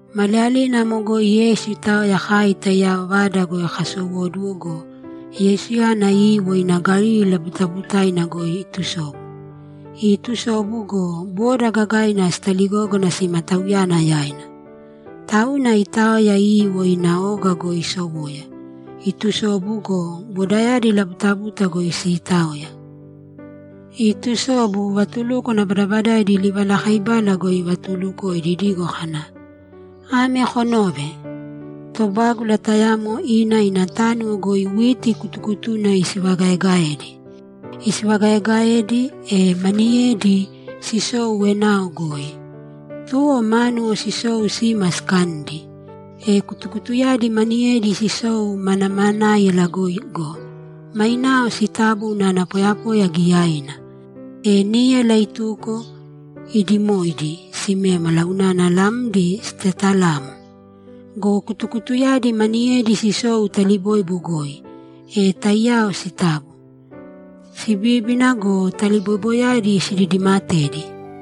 Maliyalina amo goi Yeisu itaoya kai taiyao vada goi kasowóduwo go, Yeisuyana iiwo ina Galili labutabutaina goi itusobu. Iitusobu go, boda gagaina sitaligógana sima Tauyana yaina. Tauna itaoya iiwo ina oga goi isowoya, itusobu go, bodayadi labutabuta goi siitaoya. Iitusobu, vatulúkwana badabadaidi livalakaibala goi ivatuulukoidi idigo kana, ‘Ame konōve: Tobágula tayamo ina ina tánuwo goi witi kutukutuna isivagaegaedi. Isivagaaegaedi, e maniyedi sisou enao goi. Tuwo mánuwo sisou sima sikanidi. E kutukutuyadi maniyedi sisou manamanáiyala goi go, mainao sitabo unana poyapoya giyaina. E níyala ituko, iidimoidi simémala unana lamdi sitetalamo. Go kutukutuyadi maniyedi sisou taliboibo goi, e taiyao sitabo, sibíbina go, taliboiboyadi sididimatedi.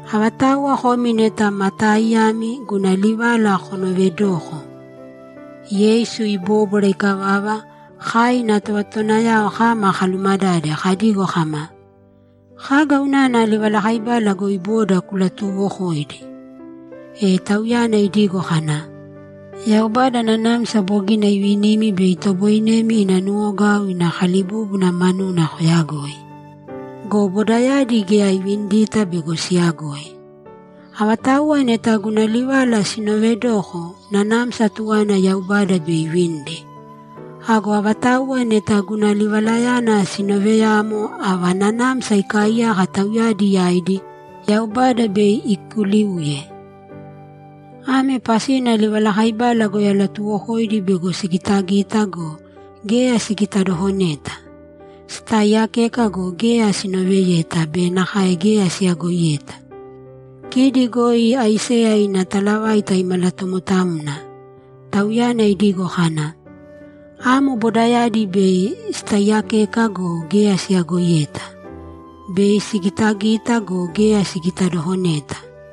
Avatauwa komi neta ma taaiyami, guna livala konoovedōko!’ Yeisu ibóbwara ikavava, kai ina tovatotowanayao kama kalumadade kadigo kama, ‘Kaga unana livalakaibala goi boda kulatuuwokoidi?’ E Tauyana idigo kana, ‘Yaubada nanamsa bogina ivinimi bei itoboinemi ina nuwogau ina kalibúbuna manuna koyagoi. Go bodayadi geya ivinidita bego siyagoi. Avatauwa neta guna livala sinoovedoko, nanamsa tuwaina Yaubada bei ivinidi. Ago avatauwa neta guna livalayana sinooveyamo, ava nanamsa ikaaiyaka tauyadi yaidi, Yaubada bei ikuliuye. Ame pasina livalakaibala goi alatuwokoidi bego sigitagita go, geya sigitadokoneta. Sitaaiyakeka go, geya sinoveyeta be nakae geya siyagoiyeta. Kidi goi Aiseya ina talavaita imalatomotamna. Tauyana idigo kana, “Bei kotaiiyakeka go, geya koyagoiyeta. Bei kogitagita go, geya kogitadokoneta.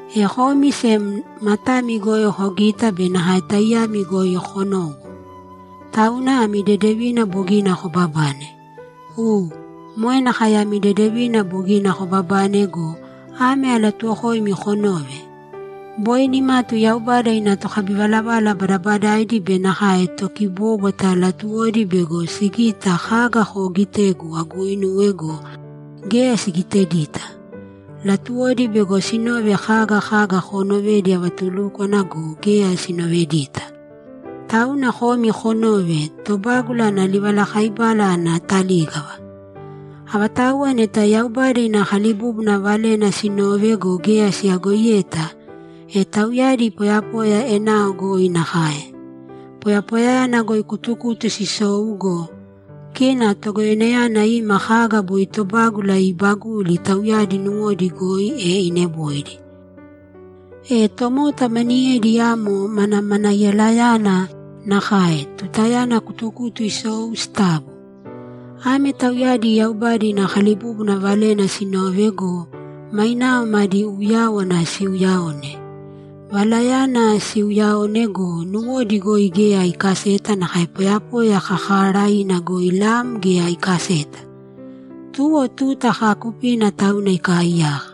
E komi sem matami goi kogita be nakae taiyami goi konowo, tauna ami dedevina bogina kobabane. U, moe nakae ami dedevina bogina kobabane go, ame alatuuwokoimi konōve: Boi nimatu Yaubada ina tokabivalavala badabadaidi be nakae tokibóbwata latuwodi bego sigite kaga koogitegu aguuinuwe go, geya sigitedita. Latuwodi bego sinove kaga kaga koonovedi avatulúkwana go, geya sinovedita. Tauna komi konōve tobágula ana livalakaibala ana talígava. Avatauwa neta Yaubada ina kalibúbuna valena sinove go, geya siyagoiyeta, e tauyadi poyapoya enao goi nakae. Poyapoyayana goi kutukutu sisou go, kina Togoyoinayana ima kaga boi tobágula iibaguli tauyadi nuwodi goi, e ineboidi. E tomota maniyedi amo manamanaiyalayana nakae tutayana kutukutu sisou sitabo. Ame tauyadi Yaubada ina kalibúbuna valena sinove go, mainao madi uyáwana siuuyaone. Valayana siuuyaone go, nuwodi goi geya ikaseta nakae poyapoya kakaaraiina goi lam geya ikaseta. Tuwo tuta kaakupina tauna ikaaiyaka.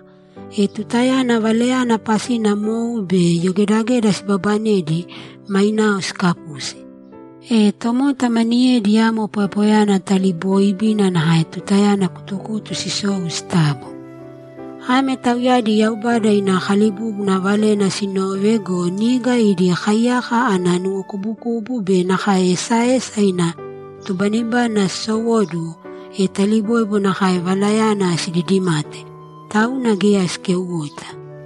E tutayana valayana pasina mou be yogedageda sibabanedi, mainao sikapusi. E tomota maniyedi amo poyapoyayana talibooibina nakae tutayana kutukutu sisou sitabo. Ame tauyadi Yaubada ina kalibúbuna valena sinove go, niga idi kaiyaka ana nuwokubukubu be nakae esaesa ina tubanibani sisowóduwo, e taliboibo nakae valayana sididimate, tauna geya sikeuwoita.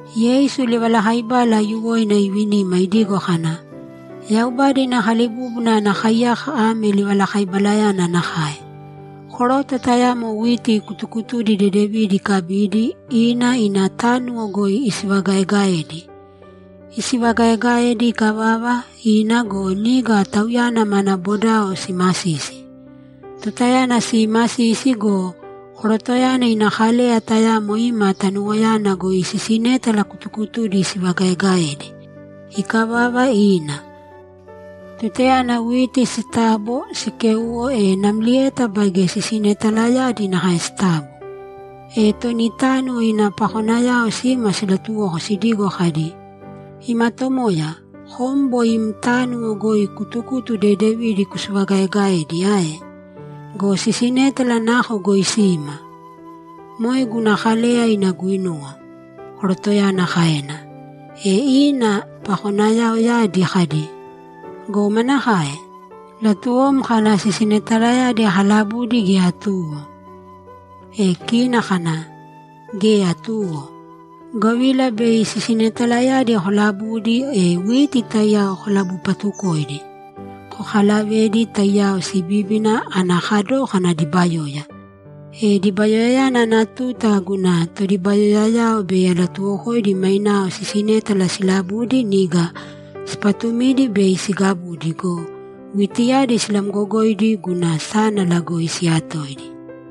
Yeisu livalakaibala aiyuwoina ivinima idigo kana, ‘Yaubada ina kalibúbuna ana kaiyaka ame livalakaibalayana nakae: Koroto tayamo witi kutukutudi dedevidi ikabidi, ina ina tánuwo goi isivagaegaedi. Isivagaegaedi ikavava, ina go, niga tauyana mana bodao simasisi. Tutayana siimasisi go, korotoyana ina kaleya tayamo ima tanuwoyana goi sisinétala kutukutudi isivagaegaedi. Ikavava, ina. Tutayana witi sitabo, sikéuwo, e namlieta baige sisinetalayadi nakae sitabo. E toni tánuwo ina pakonayao sima silatuwoko sidigo kadi, “Ima tomoya, kom boi im tánuwo goi kutukutu dedevidi kusivagaegaedi ae? Go sisinétala nako goi sima?” “Moe guna kaleya ina guinuwa”, korotoyana kaena. E ina pakonayaoyadi kadi, “Go manakae? Latuwom kana sisinetalayadi kalabudi gea tuwo?” E kina kana, “Geya tuwo, govila bei sisinetalayadi kolabudi, e witi taiyao kolabupatukoidi. Kokalavēdi, taiyao sibíbina ana kadókana dibayoya. E dibayoya ana tuta guna todibayoyayao bei alatuwokoidi mainao sisinétala silabudi, niga sipatumidi bei sigabudi go, witiyadi silamgogoidi guna sánala goi siyatoidi.”’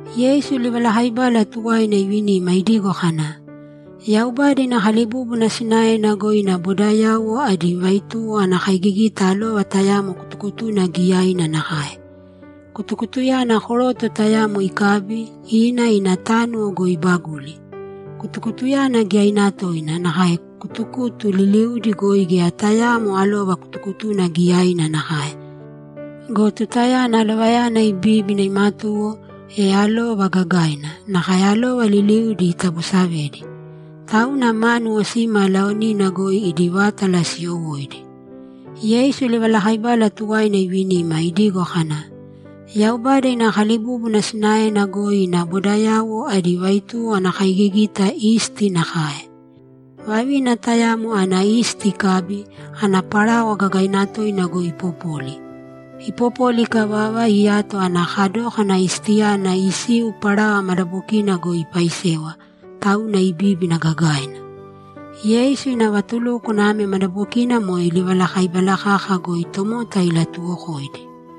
Yeisu livalakaibala tuwaina ivinima idigo kana, ‘Yaubada ina kalibúbuna sinaena goi ina bodayauwo adi vaituwo ana kaigigita alova tayamo kutukutuna giyaina nakae. Kutukutuyana koroto tayamo ikabi, ina ina tánuwo goi ibaguli. Kutukutuyana giyaina toina, nakae kutukutu liliudi goi geya tayaamo alova kutukutuna giyaina nakae. Go tutayana alovayana ibíbina imatuwo, e alova gagaina, nakae alova liliudi itabosavedi. Tauna mánuwo sima laonina goi idi vátala siyowóidi.’ Yeisu livalakaibala tuwaina ivinima, idigo kana, ‘Yaubada ina kalibúbuna sinaena goi ina bodayauwo adi vaituwo ana kaigigita isti nakae. Vavina tayamo ana isti ikabi, ana parawa gagaina toina goi ipopoli. Ipopoli ikavava, iyato ana kadókana istiyana isiu parawa madabokina goi ipaisewa, tauna ibíbina gagaina.’ Yeisu ina vatulúkwana ame madabokina moe livalakaibala kaka goi tomota ilatuuwokoidi.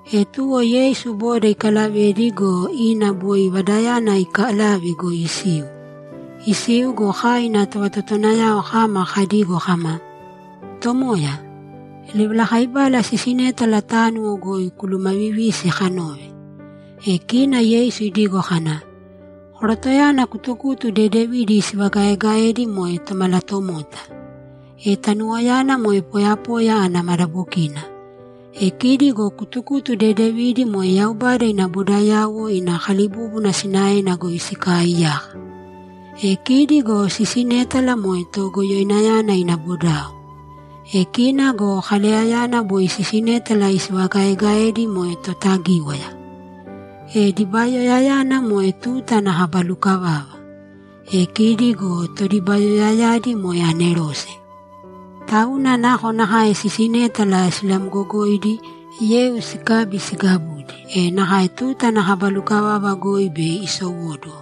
E tuwo Yeisu boda ikalavedi go, ina boi vadayana iikalave goi isiu. Isiu go, kai ina tovatotowanayao kama kadigo kama, ‘Tomoya, livalakaibala sisinétala tánuwo goi kulumavivīsi kanove.’ E kina Yeisu idigo kana, ‘Korotoyana kutukutu dedevidi isivagaegaedi moe Tomalatomota. E tanuwoyana moe poyapoya ana madabokina. E kidi go kutukutu dedevidi moe Yaubada ina bodayauwo ina kalibúbuna sinaena goi sikaaiyaka. E kidi go sisinétala moe Togoyoinayana ina bodao. E kina go kaleyayana boi sisinétala isivagaegaedi moe Totagíwaya. E dibayoyayana moe tuta ana kaba lukavava. E kidi go todibayoyayadi moe anerose. Tauna nakonakae sisinétala silamgogoidi, yeu sikabi sigabudi, e nakae tuta ana kaba lukavava goi bei isowóduwo.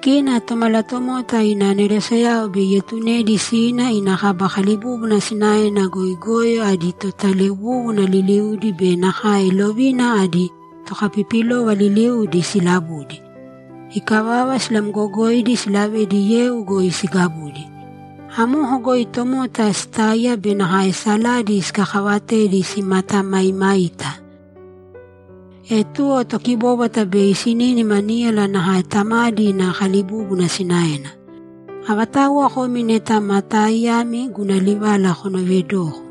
Kina Tomalatomota ina aneroseyao bei ietunedi sina ina kaba kalibúbuna sinaena goi goyo adi totalewúwuna liliudi be nakae lovina adi tokapipilova liliudi silabudi. Ikavava silamgogoidi, silavedi yeu goi sigabudi. Amoko goi tomota sitáiya be nakae saladi sikakavatedi simatamaimaita. E tuwo tokibóbwata bei sinínima níyala nakae Tamadi ina kalibúbuna sinaena. Avatauwa komi neta ma taaiyami, guna livala konoovedōko.’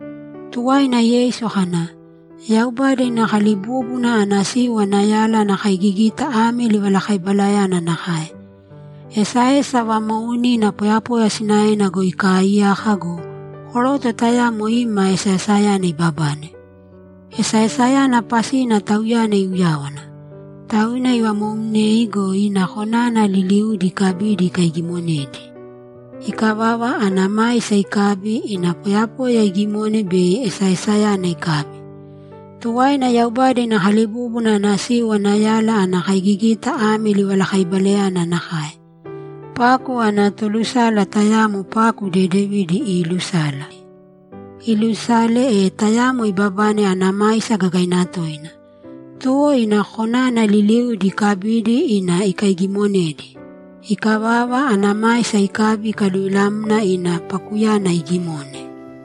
Tuwaina Yeisu kana, ‘Yaubada ina kalibúbuna ana siu ana yala ana kaigigita ame livalakaibalayana nakae: Esaesa vamoounina poyapoya sinaena goi ikaaiyaka go, koroto tayamo ima esaesayana ibabane. Esaesayana pasina tauyana iuyáwana. Tauna ivamoumnei go, ina konana liliudi ikabidi ikaigimonedi. Ikavava, ana maisa ikabi, ina poyapoya igimone bei esaesayana ikabi. Tuwaina Yaubada ina kalibúbuna ana siu ana yala ana kaigigita ame livalakaibalayana nakae: Paku ana tolusala tayamo paku dedevidi iilusala. Iilusala, e tayamo ibabane ana maisa gagaina toina. Tuwo ina konana liliudi ikabidi, ina ikaigimonedi. Ikavava, ana maisa ikabi, ikaluvilamna ina pakuyana igimone.’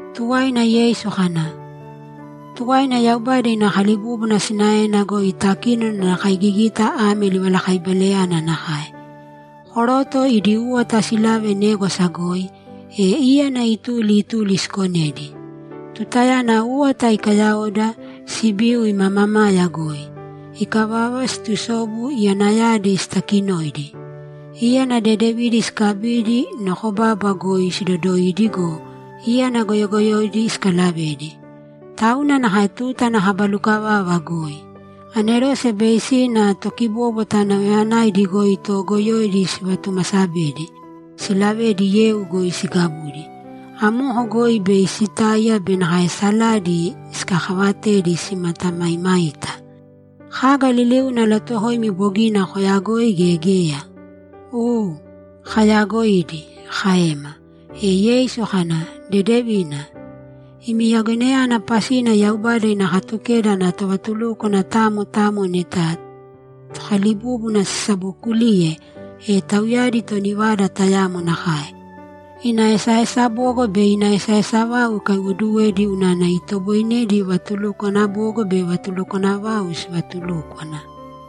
Tuwaina Yeisu kana, ‘Tuwaina, Yaubada ina kalibúbuna sinaena goi takínona ana kaigigita ame livalakaibalayana nakae: Koroto idi úwata silave négwasa goi, e íyana ituli ituli sikonedi. Tutayana úwata ikayaoda, sibiu ima mamaya goi. Ikavava, situsobu iyanayadi sitakinoidi. Íyana dedevidi sikabidi nokobaba goi sidodoidi go, íyana goyogoyoidi sikalavedi. Tauna nakae tuta ana kaba lukavava goi. Anerose bei sina tokibóbwata nauyayanaidi goi toogoyoidi sivatumasabedi, silavedi yeu goi sigabudi. Amoko goi bei sitáiya be nakae saladi sikakavatedi, simatamaimaita. Kaga liliuna alatuuwokoimi bogina koyagoidi gea geya?’ ‘U, kayagoidi’, kaema. E Yeisu kana, ‘Dedevina. Imi yagoinayana pasina Yaubada ina Katukeda ana tovatulúkwana tamo tamo neta Tokalibúbuna sisabokuliye, e tauyadi toni vada tayamo nakae; ina esaesa bogo be ina esaesa vau ikaiwoduwedi unana itoboinedi vatulukwana bogo be vatulukwana vau sivatulúkwana.’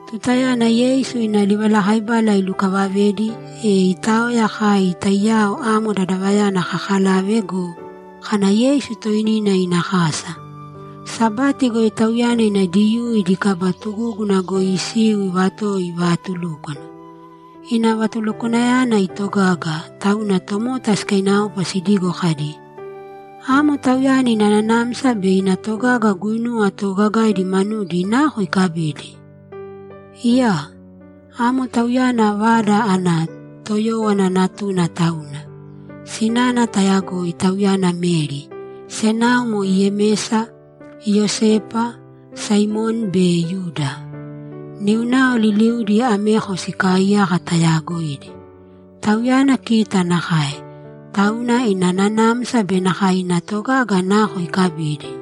Tutayana Yeisu ina livalakaibala ilukavavedi, e itaoya kai taiyao amo dadavayana kakalave go, kana Yeisu toinina ina kasa. Sabati goi Tauyana ina Diyuu idi kaba tugúguna goi isiu ivatowo ivaatulúkwana. Ina vatulukwanayana itogaga, tauna tomota sikainaopa sidigo kadi, ‘Amo Tauyana ina nanamsa be ina togaga guinuwa toogagaidi manudi nako ikabidi? Iyaa! Amo Tauyana vada ana toyówana natuna tauna. Sinana tayagoi; tauyana Meri. Senao moe Yemesa, Iyosepa, Saimoni be Yuda. Niunao liliudi ameko sikaaiyaka tayaagoidi. Tauyana kita nakae. Tauna ina nanamsa be nakae ina togaga nako ikabidi?’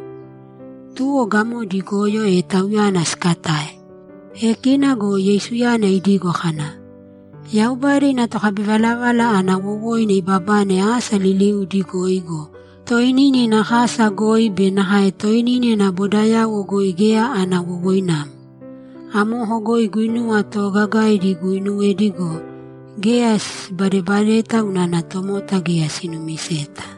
Tuwo gamodi igoyo, e Tauyana sikatae. E kina go Yeisuyana idigo kana, ‘Yaubada ina tokabivalavala ana wowoina ibabane asa liliudi goi go, toinina ina kasa goi be nakae toinina ina bodayauwo goi geya ana wowoinamo.’ Amoko goi guinuwa toogagaidi iguinuwedi go, geya sibadebadeta unana tomota geya sinumiseta.